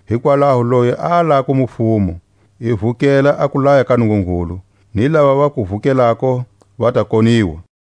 Hikwalaho loyi a alako mufumo, i vukela a kulaya ka Nungungulu; ni lava va ku vukelako va ta koniwa.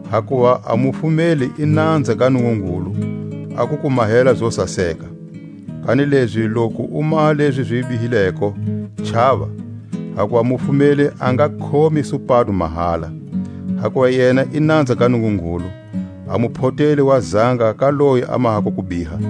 Hakuva a mufumeli i nanza ga Nungungulu a ku ku mahela zo saseka. Kanilezi loku u maha lezi zi bihileko, chava; hakuva mufumeli a nga khomi supado mahala; hakuva yena i nanza ga Nungungulu, a muphoteli wa zanga ka loyi a mahako kubiha.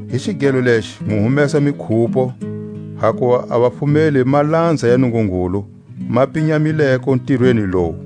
Hi xigelo lexi mu humesa mikhupo; hakuva a vafumeli malanza ya Nungungulu, ma pinyamileko ntirweni lowu.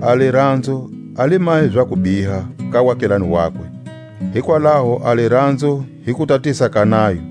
A liranzo a li mahi za kubiha ka waakelane wakwe; hikwalaho a liranzo hi kutatisa ka nayo.